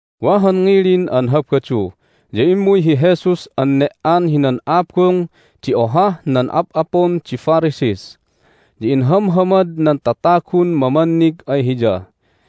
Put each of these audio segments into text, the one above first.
Wa han ngilin an Habadu ya immuy hi Jesus an ne"an hinan abung di ohah nan ap'apun di Pharisees, ya inhamhamad nan tatagun mamannig ay Hiya,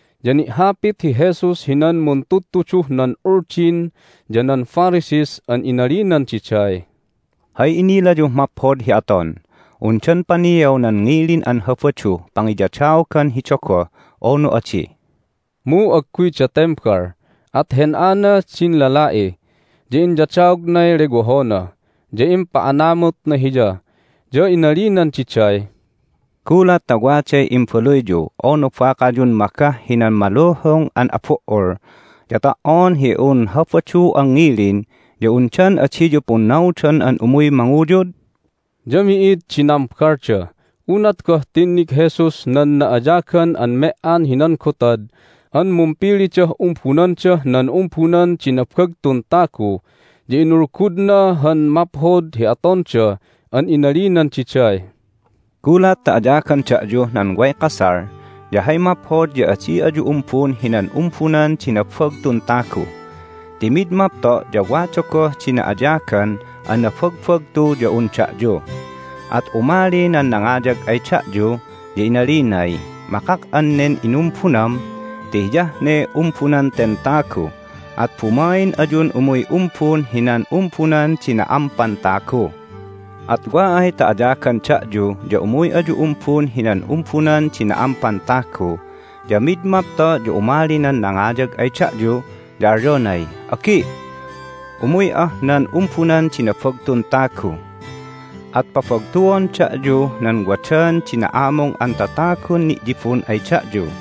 Ya ni'hapit hi Jesus hinan muntudtuduh nan Uldin ya nan Pharisees an inalinan diday, "Hay inilayuh maphod hi aton? Undan paniaw nan ngilin an Habaduh pangiyadaogan hi dogoh, unu adi?" Mu agguyda tembal. At hen'ana din lala'i, ya inyadaognay lewohona, ya impa'anamutna hiya. Ya inalinan diday, "Gulat ta waday imbaluyyu unu bakayun magah hinan maluhung an abu"ul ya ta"on hi un Habadu an ngilin ya undan adiyu punnaudon an umuy manguyud?" Ya mi'id di nambalda. Unat goh tinnig Jesus nan na'ayagan an me"an hinan gotad an mumpilidah umbunandah nan umbunan di nabagtun tagu ya inulgudna han maphod hi atonda an inalinan diday, "Gulat ta ayagan da'yuh nan way kasal ya hay maphod ya adi ayu umbun hinan umbunan di nabagtun tagu. Ti mid mapto' ya wada goh di na'ayagan an nabagbagtu ya un da'yu, at umali nan nangayag ay da'yu, ya inalinay, Makak'an nen inumbunam ti hiyah ne umbunan ten tagu. At bumain ayun umuy umbun hinan umbunan di na'ampan tagu. At wa ay ta ayagan da'yu ya umuy ayu umbun hinan umbunan di na'ampan tagu, ya mid mapto' ya umali nan nangayag ay da'yu, ya alyonay, Agi', umuy'ah nan ubunan di nabagtun tagu. At pabagtuon da'yuh nan wadan di na'amung an tatagun ni'yibun ay da'yu.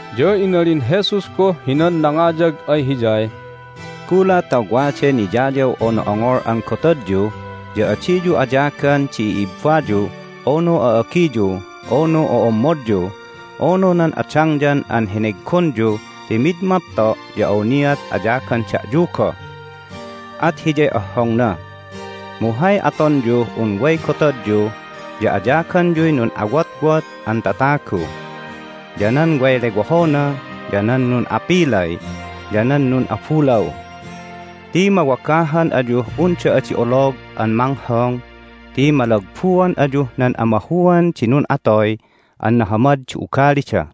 Ya inalin Jesus goh hinan nangayag ay hiyay, "Gulat ta waday niyayaw unu ongol an gotadyu ya adiyu ayagan di i'ibbayu, unu a'agiyu, unu o'ommodyu, unu nan adangyan an heneggonyu ti mid mapto' ya awniat ayagan da'yu goh, at hiyay ohhongna. Mu hay atonyuh un way gotadyu ya ayaganyuy nun'awotwot an tatagu, ya nan way lewohona, ya nan nun'apilay, ya nan nun'abulaw. Ti mawagahan ayuh unda adi olog an manghong ti malagbuan ayuh nan amahuan di nun'atoy an nahamad di ugalida."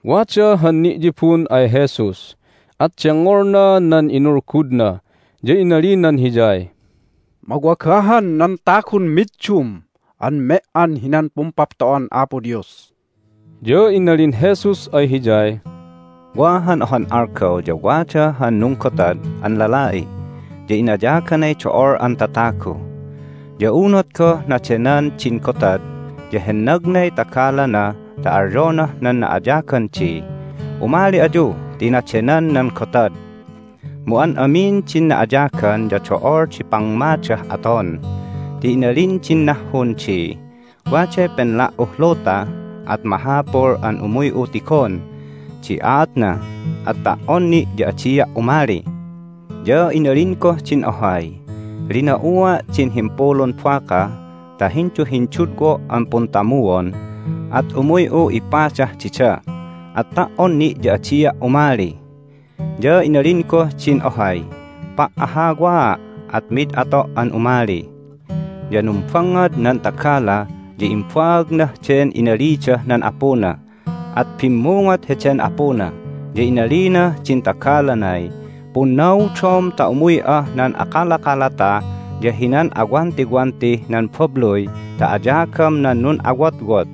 Wada han ni'yibun ay Jesus, at dengngolna nan inulgudna, ya inalinan Hiyay, "Mawagahan nan tagun middum an me"an hinan Pumpapto'an Apo Dios!" Ya inalin Jesus ay hiyay, "Wa han ohan algaw ya wada han nunggotad an lala'i, ya inayaganay do'ol an tatagu. Ya unat goh nadenan din gotad ya hennagnay tagalana ta alyonah nan na'ayagan di, Umali ayu ti nadenan nan gotad! Mu an amin din na'ayagan ya do'ol di pamngadah aton, ti inalin din nahhun di, Waday penla"uh luta, at mahapul an umuy'u tigon di aatna. At ta"on ni' ya adia' umali. Ya inalin goh din ohay, Lina'ua' din himpulun baka ta hinduhindudwo' an puntamuon, at umuy'u ipadah dida. At ta"on ni' ya adia' umali. Ya inalin goh din ohay, Pa'ahhawaa', at mid ato' an umali. Ya numbangngad nan tagala, ya imbaagnah den inalidah nan apuna. At bimmungot heden apuna, ya inalinah din tagalanay, Punnaudom ta umuy'ah nan akalakalata ya hinan awantiwantih nan babluy ta ayagam nan nun'awotwot,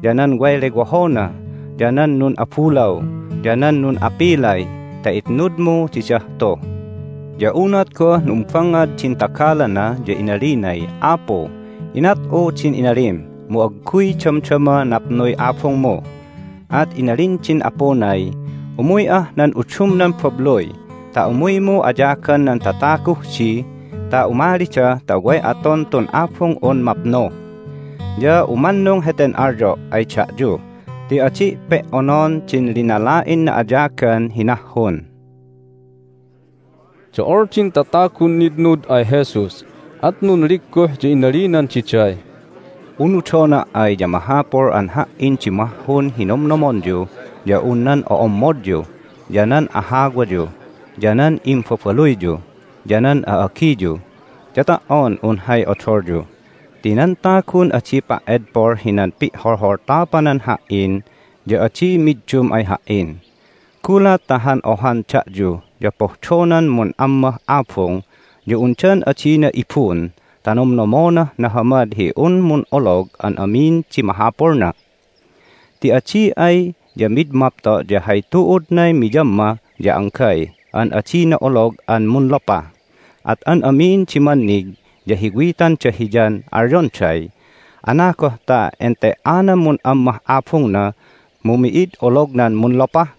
ya nan way lewohona, ya nan nun'abulaw, ya nan nun'apilay ta itnudmu didah tu! Ya unat goh numbangngad din tagalana ya inalinay, Apu, inat'u din inalim, mu agguy damdama napnuy abungmu! At inalin din apunay, Umuy'ah nan udumnan babluy ta umuymu ayagan nan tataguh di ta umalida ta way aton tun abung'un mapnu! Ya umannung heten alyo' ay da'yu ti adi' pe"onon din linala'in na'ayagan hi nahhun!" Do'ol din tatagun nitnud ay Jesus. At nunligguh, ya inalinan diday, "Unudona' ay ya mahapul an Ha"in di mahhun hi nomnomonyu ya un nan o'ommodyu, ya nan ahawayu, ya nan imbabaluyyu, ya nan a'agiyu, ya ta"on un hay odolyu. Ti nan tagun adi pa"edpol hinan pi'holholtapanan Ha"in ya adi middum ay Ha"in. Gulat ta han ohan da'yu ya pohdonan mun'ammah abung ya undan adina ibun ta nomnomonah nahamad hi un mun'olog an amin di mahapulna? Ti adi ay ya mid mapto' ya hay tu'udnay miyamma ya anggay an adina olog an munlopah, at an amin di mannig ya hiwitanda hiyan alyonday, Anagoh ta ente"anan mun'ammah abungna, mu mi'id olognan munlopah!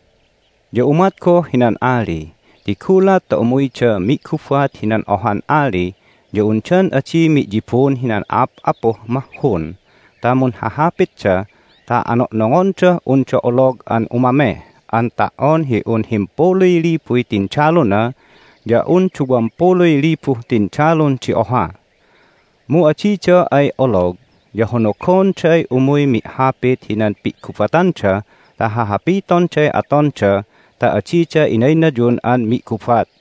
Ya umat goh hinan ali, ti gulat ta umuyda mi'gubat hinan ohan ali ya undan adi mi'yibun hinan a'ap'apuh mahhun ta munhahapitda ta ano'nongondah unda olog an umameh an ta"on hi un himpuluy libuy tindaluna ya un duwam puluy libuh tindalun di oha? Mu adida ay olog ya honogonday umuy mi'hapit hinan pi'gubatanda ta hahapitonday atonda ta adida inaynayun an mi'gubat.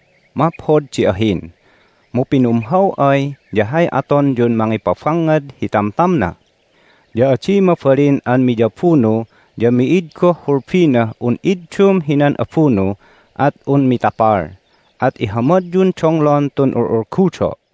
Maphod di ahin, mu pinumhaw ay ya hay atonyun mangipabangngad hi tamtamna? Ya adi mabalin an miyabunu, ya mi'id goh hulbinah un iddum hinan abunu, at un mitapal. At ihamadyun donglon tun ul'ulgudo'."